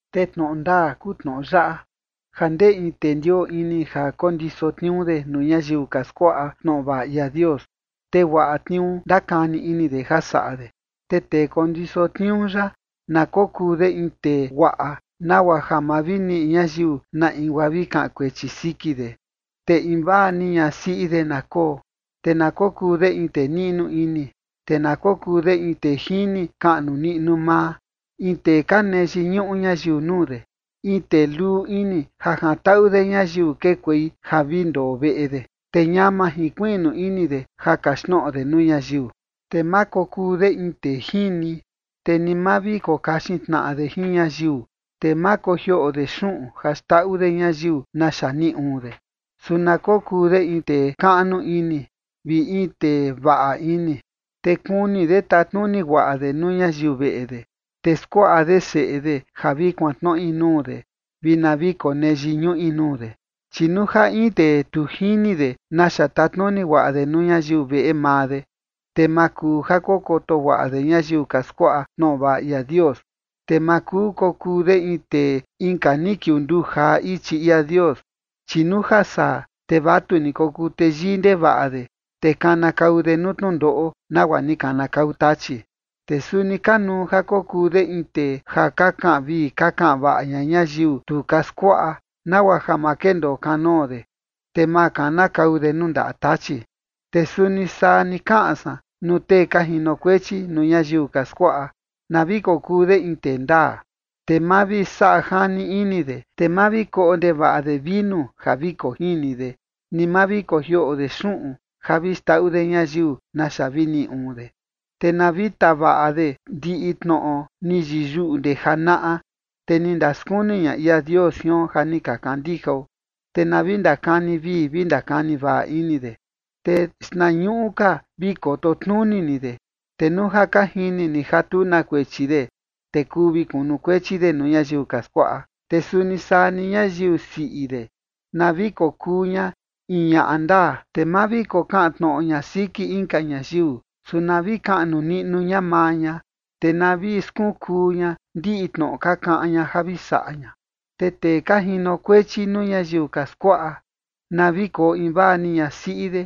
Te tnoꞌo ndaa kuu tnoꞌo yaꞌa: ja ndee in tee ndioo ini ja kondiso tniuu de nuu ñayiu ka skuaꞌa tnoꞌo vaꞌa ia Dios, te guaꞌa tniuu ndakani ini de ja saꞌa de. Te tee kondiso tniuu yaꞌa na kokuu de in tee guaꞌa, nagua ja ma vi niꞌi ñayiu na in guaa vi kaꞌan kuechi siki de, te in vaa ni ñasiꞌi de na koo, te na kokuu de in tee niꞌnu ini, te na kokuu de in tee jini kaꞌnu niꞌnu maa, in tee ka nee yiñuꞌu ñayiu nuu de, in tee luu ini ja jantaꞌu de ñayiu kekuei ja vi ndoo veꞌe de, te ñama jinkuiꞌnu ini de ja kaxtnoꞌo de nuu ñayiu. Te ma kokuu de in tee jini, te ni ma vi kokaxin tnaꞌa de jin ñayiu, te ma kojioꞌo de xuꞌun ja xndaꞌu de ñayiu naxa niꞌi uun de. Su na kokuu de in tee kaꞌnu ini, vi in tee vaꞌa ini. Te kuni de tatnuni guaꞌa de nuu ñayiu veꞌe de, te skuaꞌa de seꞌe de ja vi kuantnoꞌi nuu de vi na vi konee yiñuꞌi nuu de. Chi nuu ja in tee tu jini de naxa tatnuni guaꞌa de nuu ñayiu veꞌe maa de, te ma kuu ja kokoto guaꞌa de ñayiu ka skuaꞌa tnoꞌo vaꞌa ia Dios. Te ma kuu kokuu de in tee inka ni kiunduu jaa ichi ia Dios, chi nuu ja saa, te vatu ni kokuu teyii ndevaꞌa de, te kanakau de nuu tnundoꞌo nagua ni kanakau Tachi. Te suni kanuu ja kokuu de in tee ja ka kaꞌan vii ka kaꞌan vaꞌa ña ñayiu tu ka skuaꞌa, nagua ja ma kendoo kanoo de, te ma kanakau de nuu ndaꞌa Tachi. Te suni saa ni kaꞌan san nuu tee ka jinokuechi nuu ñayiu ka skuaꞌa, na vi kokuu de in tee ndaa, te ma vi saꞌa jani ini de, te ma vi koꞌo ndevaꞌa de vinu ja vi kojini de, ni ma vi kojioꞌo de xuꞌun ja vi xndaꞌu de ñayiu naxa vi niꞌi uun de. Te na vi tavaꞌa de ndiꞌi tnoꞌo ni yiyuꞌu ndee janaꞌa, te ni ndaskuni ña ia Dios jion ja ni ka kandijao, te na vi ndakani vii vi ndakani vaꞌa ini de. Te xtnañuꞌu ka vi koto tnuni ni de, te nuu ja ka jini ni ja tu na kuechi de, te kuu vi kunukuechi de nuu ñayiu ka skuaꞌa. Te suni saa ni ñayiu siꞌi de, na vi kokuu ña in ñaꞌa ndaa, te ma vi kokaꞌan tnoꞌo ña siki inka ñayiu. Su na vi kaꞌnu niꞌnu ña maa ña, te na vi skunkuu ña ndiꞌi tnoꞌo ka kaꞌan ña ja vi saꞌa ña. Te tee ka jinokuechi nuu ñayiu ka skuaꞌa, na vi koo invaa ni ñasiꞌi de,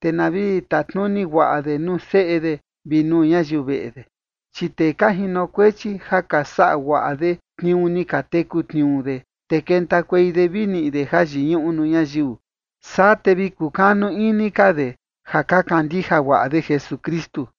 te na vi tatnuni guaꞌa de nuu seꞌe de vi nuu ñayiu veꞌe de. Chi tee ka jinokuechi ja ka saꞌa guaꞌa de tniuu ni ka teku tniuu de, te kentakuei de vi niꞌi de jayiñuꞌu nuu ñayiu, saa te vi kukanu ini ka de ja ka kandija guaꞌa de Jesukristu.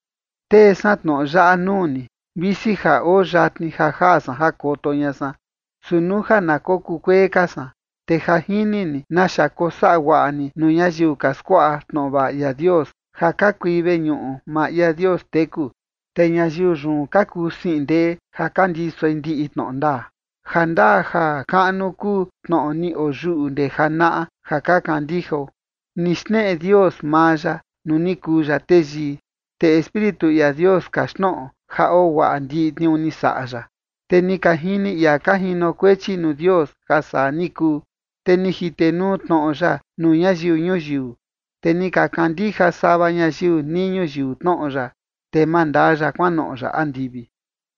Tee san tnoꞌo yaꞌa nuu ni, visi ja oo yatni ja jaa san ja koto ña san. Su nuu ja na kokuu kuee ka san, te ja jini ni naxa kosaꞌa guaꞌa ni nuu ñayiu ka skuaꞌa tnoꞌo vaꞌa ia Dios, ja ka kui veñuꞌu maa ia Dios teku, te ñayiu yun ka kuu siꞌin ndee ja ka ndisoi ndiꞌi tnoꞌo ndaa. Ja ndaa ja kaꞌnu kuu tnoꞌo ni oyuꞌu ndee janaꞌa ja ka kandijao: Ni xneꞌe Dios maa ya nuu ni kuu ya teyii, Te Espíritu ia Dios kaxtnoꞌo ja oo guaꞌa ndiꞌi tniuu ni saꞌa ya. Te ni ka jini ia ka jinokuechi nuu Dios ja saa ni kuu. Te ni jitenuu tnoꞌo ya nuu ñayiu ñuyiu. Te ni ka kandija sava ñayiu nii ñuyiu tnoꞌo ya. Te mandaa ya kuanoꞌo ya andivi.